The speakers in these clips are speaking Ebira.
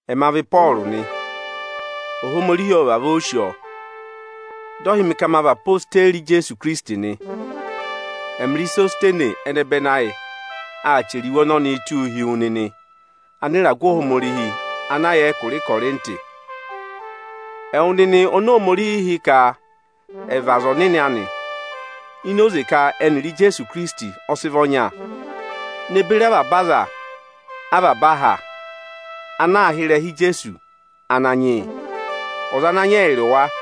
Ẹma vị Ịpọọrụ nị. Ohomorihi ọ vavọọ sì ọọ, dị ọ hị́ mị ka ma vị odeyi Ijeesu Ikirisiti nị. Ẹmịrị Isositenesi ẹnẹbẹnị ayị aa chẹrẹ iwe ọnọnịị tụ́ụ hi wu nịnị anịragụ Ohomorihi ana yà ẹkụra Ịkọrịntị, ẹwụ nịnị oni Ohomorihi hị́ ka ẹ̀ vị aza ọnịnị anị, ini oze ka ẹnịrị Ijeesu Ikirisiti ọ sị vị ọnya, ne beri avaba aza avaba aha ana aa hị́ ịrẹha Ijeesu Ananyị yị, ọza ana nyị ẹyịrị wa.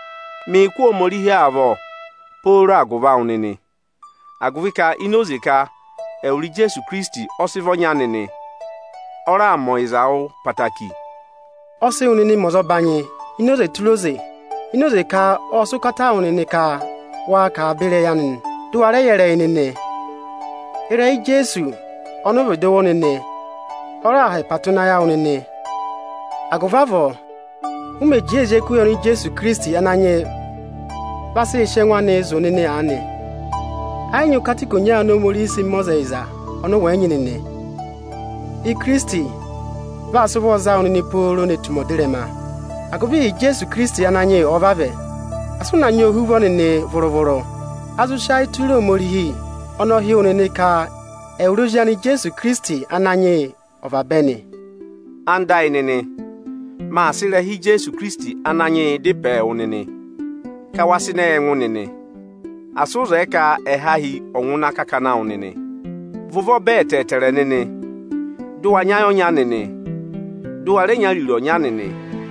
Mịị̄ kụ́ Ohomorihi amị avọ pooro agụvị awụ nịnị, agụvị ka ini oze ka ẹwụrị Ijeesu Ikirisiti ọ sị vị ọnya nịnị, ọ raà mẹ ọyịza yị wụ ẹtẹẹtẹrẹ. Ọ sị wụ nịnị mẹ ọzọbanyị ini oze tụra oze ini oze ka ọ́ọ sị ụkata wụ nịnị ka waa kà avaba ịrẹyị anị, dụ wa rẹ yẹ ịrẹyị nịnị. Ịrẹyị Ijeesu Ikirisiti (ọnị ụ vịdị wụ́ nịnị) ọ raà ha ẹpa tụ́ ịnị ayị awụ nịnị; agụvị avọọ, ụ mẹ̀ jẹẹ ee zí ẹkụhị oni Ijeesu Ikirisiti Ananyị yị vaa sị sị ẹngụ anịị zụ̀ nịnị aanị, ẹ yị nyị ụkata ikonya oni Ohomorihiī sịị mẹ ọza ẹyịza ọnị ụ wẹ̀ yị nyị nịnị. Ikirisiti vaa sị ụvọọ za wụ nịnị pooro ne tù ụmẹ ọdịrẹma, agụvị ịhị Ijeesu Ikirisiti Ananyị yị ọ̀ọ vavẹ, asị ụ na nyị ohuvọ nịnị vụrụ-vụrụ. A zụ sị ayị tụra Ohomorihi. Ọnị ọ hị́ wụ nịnị ka ẹwụrị Ozi anị Ijeesu Ikirisiti Ananyị yị ọ̀ vabẹ nị. Ẹwụ nịnị ẹyịnyara amị, máa sị ịrẹha Ijeesu Ikirisiti Ananyị yị dá ịpẹ wụ nịnị ka wa sị ịnẹ yị ẹngụ nịnị. Asị ụ zẹẹ ka ẹhahi ọ̀ ngụ ịnị akakana awụ nịnị! Và ụvọ bẹ ẹtẹẹtẹrẹ nịnị, dụ wa nyị ayị ọnya nịnị, dụ wa rẹ nyị ariro ọnya nịnị!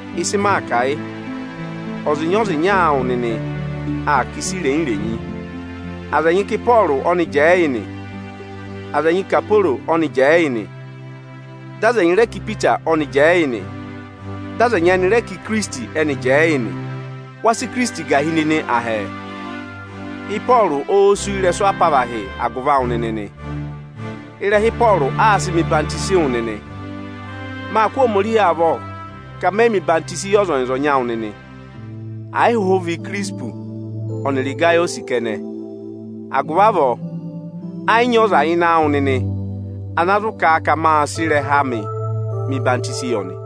Ịsị maa kà, yị: ọzịnya-ọzịnya awụ nịnị aa kà ịsa irenyi-renyi. Aza ẹnyị ka Ịpọọrụ ọ́nị jẹẹ yị nị, aza ẹnyị ka Aporo ọ́nị jẹẹ yị nị, dị aza ẹnyị rẹ ka Ipita ọ́nị jẹẹ yị nị. Dị aza ẹnyị ẹnị rẹ ka Ikirisiti ẹ́nị jẹẹ yị nị. Wa sị Ikirisiti gà hi nịnị, ahẹẹ? Ịpọọrụ óó sú ị́rẹsụ apavahị agụvị awụ nịnị nị? Ịrẹha Ịpọọrụ áá sị mẹ̀ ọyịhwọzenyi wụ nịnị nị? Máa kụ́ Ohomorihi avọ ka mẹyị mẹ̀ ọyịhwọzenyi yị ọzọnyị-ọzọnyị awụ nịnị, àyị hụhụ vị Ikirisiti ọnịrị Ịgayọsị kẹnẹ. Agụvị avọọ, ẹ yị nyị ọza ịnị awụ nịnị ana zụ kà a ka máa sị ịrẹha amị mẹ̀ ọyịhwọzenyi yị ọnị.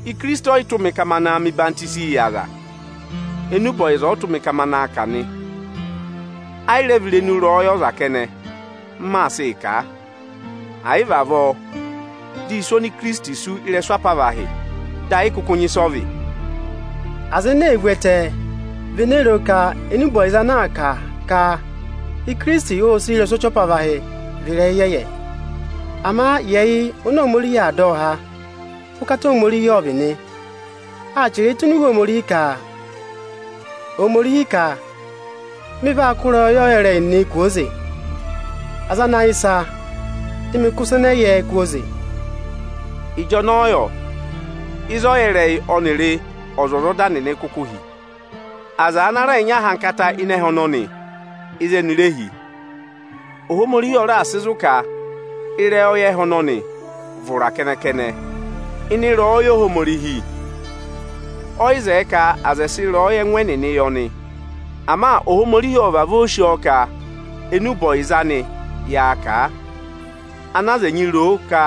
Ikirisiti ọyị tụ́ mị ka ma naa mẹ ọyịhwenyii yị aza. Enube ọyịza ọ tụ́ mị ka ma naa kà nị. Ẹ yị rẹ vị irenu ịrẹyọyẹ ọza kẹnẹ, m maa sịị kà a; àyị vị avọọ, di isu oni Ikirisiti sú ị́rẹsụ apavahị dị ẹ yị kụkụ nyị ịsị ọ vị. Aza ene ee vu ẹtẹ vị ene roo ka enube ọyịza ana aa kà ka Ikirisiti óo sú ị́rẹsụ ọchị apavahị vị ịrẹyị ịyẹyẹ. Ama yị ẹyị oni Ohomorihi aa dọ ọ há, ụkata Ohomorihi ọ vị nị. Áa chẹrẹẹ tụ́ ini Iwe Ohomorihi ka (Ohomorihi ka): “Mị vaa kụ́ ịrẹyọyẹ ọyẹrẹyị nịnị ị kwooze; aza ana yẹ ịsa, dị mị kụ́ ịsa ẹnẹ ẹ yẹ kwooze.” Ịjọnọọ yọ, ịzị ọyẹrẹyị ọnịrị ọzwọzọda nịnị kuku hi? Aza ana rẹẹ̄ nyị ahankata ịnị ẹhẹ ọnọnị, ịzị eni re hi? Ohomorihi ọ raà sị zụ̀ ka ịrẹyọyẹ ẹhẹ ọnọnị vị ụra kẹnẹ-kẹnẹ. Ịnị ịrẹyọyẹ Ohomorihi, ọyị zẹẹ ka aza ẹ̀ sị ịrẹyọyẹ ẹngụ ẹnịnị yẹ ọnị. Ama Ohomorihi ọ́ọ vavọọ sì ọọ ka enube ọyịza ọnị yaa kà, ana aza ẹnyị ro ka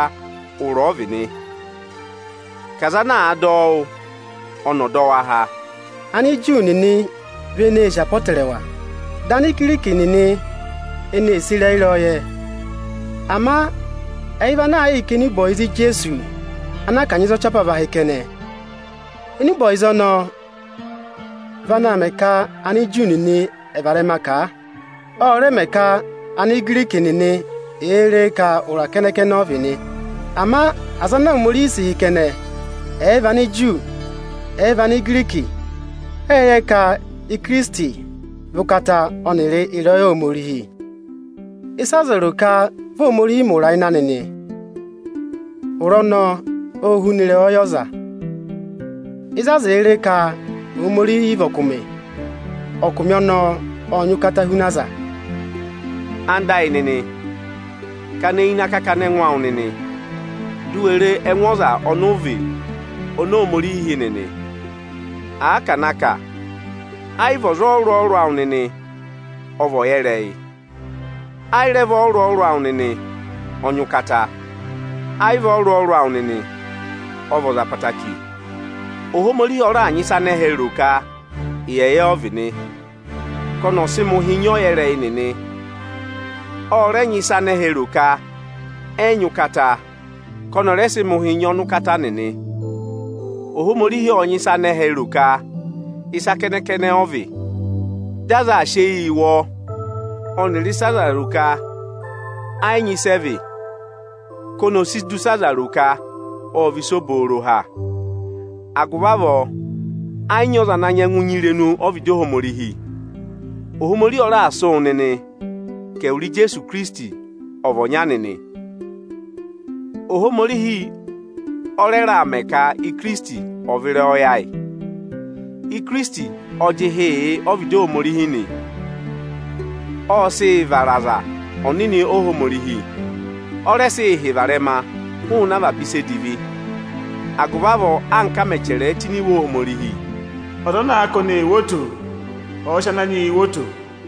ụra ọ vị nị, ka aza ana àa dọ ọ wụ́ ọnị ọ̀ dọ wa há. Aniju nịnị vị eneē sì apọtẹrẹwa; dị Anigiriki nịnị ẹnị ee sì ịrẹyị ịrẹyọyẹ. Ama ẹyị vị ana aa kịị kà enube ọyịza Ijeesu ana a kanyị za ọchị apavahị kẹnẹ. Enube ọyịza ọnọọ vị ana aa mẹ ka Aniju nịnị ẹ̀ và ịrẹma kà a. Ọ rẹ mẹ ka Anigiriki nịnị è ree ka ụra kẹnẹ-kẹnẹ ọ vị nị. Ama aza oni Ohomorihi sị hị́ kẹnẹ, ẹ̀ẹ vị Aniju, ẹ̀ẹ vị Anigiriki, ẹ́ẹ yẹ ka Ikirisiti vị ụkata ọnịrị ịrẹyọyẹ Ohomorihi. Ịsị aza ro ka vị Ohomorihi mẹ ụra ịnị anị nị, ụra ọnọọ óo huna ịrẹyọyẹ ọza. Ịzị aza èe ree ka Ohomorihi vị ọkụmị, ọkụmị ọnọọ ọ́ọ nyị ụkata huna aza. Ẹwụ nịnị ẹyịnyara amị, kana eyi ịnị akakana ẹngụ awụ nịnị, di u we re ẹngụ aza ọnị ụ vị oni Ohomorihi hị́ nịnị. Àa ka à na kà, ayị vị aza ọrụrụ-ọrụrụ awụ nịnị ọ vị ọyẹrẹyị, ayị rẹ vị ọrụrụ-ọrụrụ awụ nịnị ọ nyị ụkata, ayị vị ọrụrụ-ọrụrụ awụ nịnị ọ vị ọza ẹtẹẹtẹrẹ. Ohomorihi ọ raà nyị ịsị anẹhẹ ro ka ịyẹyẹ ọ vị nị, ka ọnị ọ̀ sị mẹ̀ ụhị nyị ọyẹrẹyị nịnị. Ọ rẹ nyị ịsị anẹhẹ ro ka ẹyị nyị ụkata ka ọnị ọ̀ rẹ sị mẹ̀ ụhị nyị ọnụkata nịnị. Ohomorihi ọ́ọ nyị ịsị anẹhẹ ro ka ịsa kẹnẹ-kẹnẹ ọ vị, dị aza aa sị eyii wụ ọọ ọnịrị ịsị aza ro ka ẹ yị nyị ịsị ẹ vị ka ọnị ò si du ịsị aza ro ka ọ́ọ vị ịsa obooro ha. Agụvị avọọ ẹ yị nyị ọza ana nyẹngụ nyị irenu ọ́vịdị Ohomorihi. Ohomorihi ọ raà sị wụ nịnị ka ẹwụrị Ijeesu Ikirisiti ọ̀ vị ọnya nịnị. Ohomorihi ọ rẹ raà mẹ ka Ikirisiti ọ̀ vị ịrẹyọyẹ ayị. Ikirisiti ọ jị ịhị yị ọ́vịdị Ohomorihi nị, ọ sị yị vara aza ọnịnị Ohomorihi, ọ rẹ sị yị hị́ varẹma hụụnị avaba ịsa edivi. Agụvị avọọ, anka a mẹ̀ chẹrẹẹ tụ́ ini Iwe Ohomorihi: “Ọza ana àa ka oni ee wo oto, ọ̀ọ sị Ananyị yịị woo oto.”